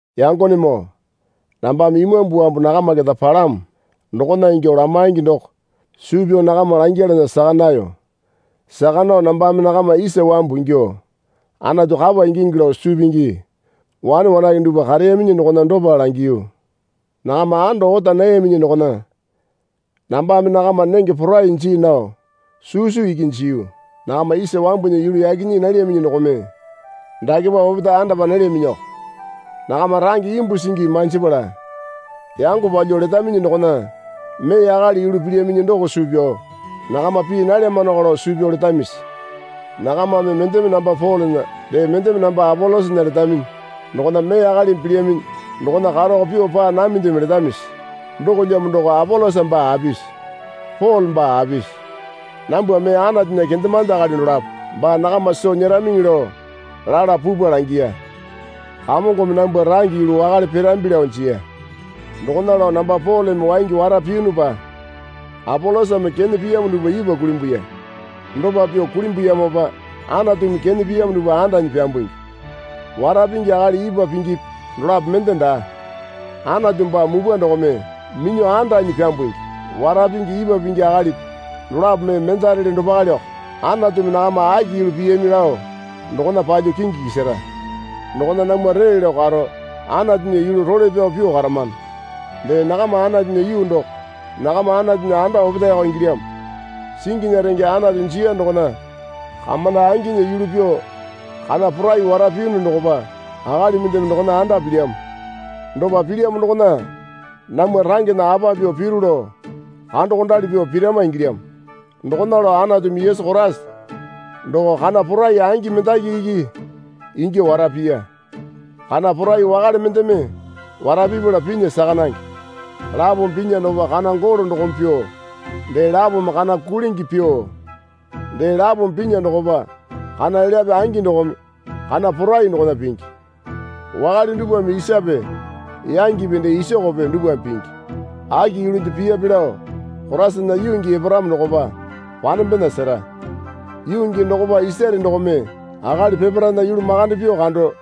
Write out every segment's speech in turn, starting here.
Yangonemoo nambame Imambu wambu nakama keta palamo dokona ingyuo lamaingi doko suu pyao nakama langyalana saka nayo. Saka nao nambame nakama isa wambu ingyuo Anatu kapa ingingi lao suu pingi wane wanake dupwa kareyaminyi dokona dopa langiyu. Nakama ando ota nayaminyi dokona nambame nakama nenge porai jii nao susu iki jiyu. Nakama isa wambunya yulu yaki nyii nalyaminyi dokome dakepa opetae andapa nalyaminyioko. Nakama range imbu singi manjipala yango palyuo letaminyi dokona mee akali yulu pilyaminyi doko suu pyao nakama pii nalyamanoko lao suu pyao letamisi? Nakamame mendeme namba Polena dee mendeme namba Apolosana letaminyi dokona mee akalimi pilyaminyi dokona karako pyuo paa namindeme letamisi? Dokolyamo doko Apolosa baa apisi? Pole baa apisi? Nambwa mee Anatunya kendemande akali dolapo baa nakama soo nyeramiŋi lao lala pupwa langiya. Kamongome nambwa range yulu wakale pirambi lao jiya. Dokona lao namba Poleme waingi wara piyunupa Apolosame kene piyamo dupwa ipwa kulimbuya. Dopa pyuo kulimbuyamopa Anatumi kene piyamo dupwa andanyi pyambungi. Wara pingi akali ipwa pingipi dolapo mende daa. Anatu baa mupwa dokome minyuo andanyi pyambungi. Wara pingi ipwa pingi akalipi dolapo mee mendarele dopaleoko. Anatumi nakama aki yulu piyami lao dokona palyuo kingi kisara. Dokona namwa ree lao karo Anatunya yulu role pyao pyuo karamano. Dee nakama Anatunya yuu doko. Nakama Anatunya anda opetaeko ingilyamo. Singinya renge Anatu jiya dokona kamonda anginya yulu pyuo kana porai wara piyunu dokopa akali mendeme dokona anda pilyamo. Dopa pilyamo dokona namwa rangena apa pyuo piru lao kandokondali pyuo pirama ingilyamo. Dokona lao Anatumi Yesu Koraisa doko kana porai angi mendaki iki ingyuo wara piya. Kana porai wakale mendeme wara pipala pinya saka nange. Lapome pinya dokopa kana golo dokome pyuo dee lapome kana kulingi pyuo dee lapome pinya dokopa kana elyape angi dokome kana porai dokona pingi. Wakale dupwame isape yangipi dee isokope dupwame pingi. Aki yulunde piyape lao Koraisana yuu gii eparamo dokopa panembena sera. Yuu gii dokopa isare dokome akali peparaena yulu makande pyuo kando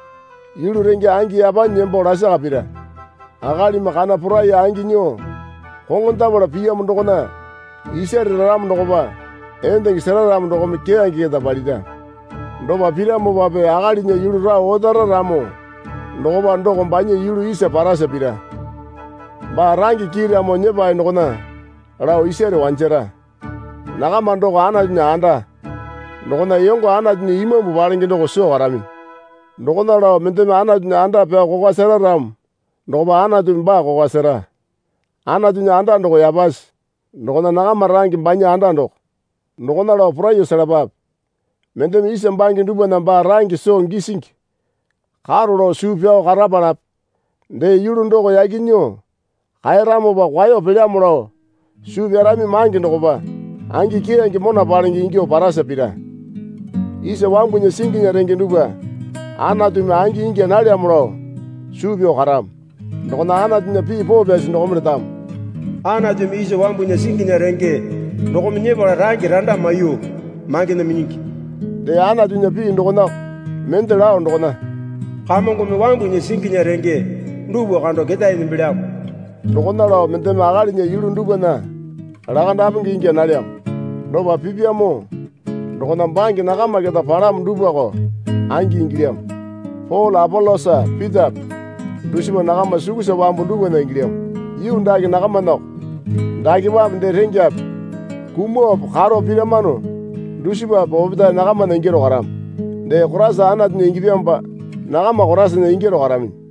yulu renge angi yapanyi nembo lasaka pira. Akalimi kana porai angi nyuo koŋondapala piyamo dokona isare raramo dokopa endenge sera ramo dokome keyange keta palira. Dopa piramopape akalinya yulu rao otara ramo dokopa doko banya yulu isa parasa pira. Baa range kiiramo nyepae dokona lao isare wanjara. Nakama doko Anatunya anda. Dokona yongo Anatunya Imambu palenge doko soo karaminyi. Dokona lao mendeme Anatunya anda pyao kokwa sera ramo dokopa Anatumi baa kokwa sera. Anatunya anda doko yapasi. Dokona nakama range banya anda doko. Dokona lao poraiyuo selapape. Mendeme isa bange dupwana baa range soo gisingi karo lao suu pyao karapalape dee yulu doko yaki nyuo kaeramopa kwaeyo pelyamo lao suu pyarami mange dokopa angi keyange mona palenge ingyuo parasa pira. Isa wambunya singinya renge dupwa Anatumi angi ingya nalyamo lao suu pyao karamo. Dokona Anatunya pii poo pyasi dokome letamo. Anatumi isa wambunya singinya renge dokome nyepala range randa maiyuo mangena minyingi. Dee Anatunya pii dokonako mende lao dokona, Kamongome wambunya singinya renge dupwa kando keta nembelyamo. Dokona lao mendeme akalinya yulu dupwana lakandapenge ingya nalyamo. Dopa pipyamo dokona bange nakama keta palamo dupwako angi ingilyamo. Pole Apolosa Pitape dusipa nakama sukusa wambu dupwana ingilyamo. Yuu dake nakamanako. Dakepape dee rengyape kumuope karo piramano dusipape opetae nakamana ingyaro karamo. Dee Koraisa Anatunya ingyapyamopa nakama Koraisana ingyaro karaminyi.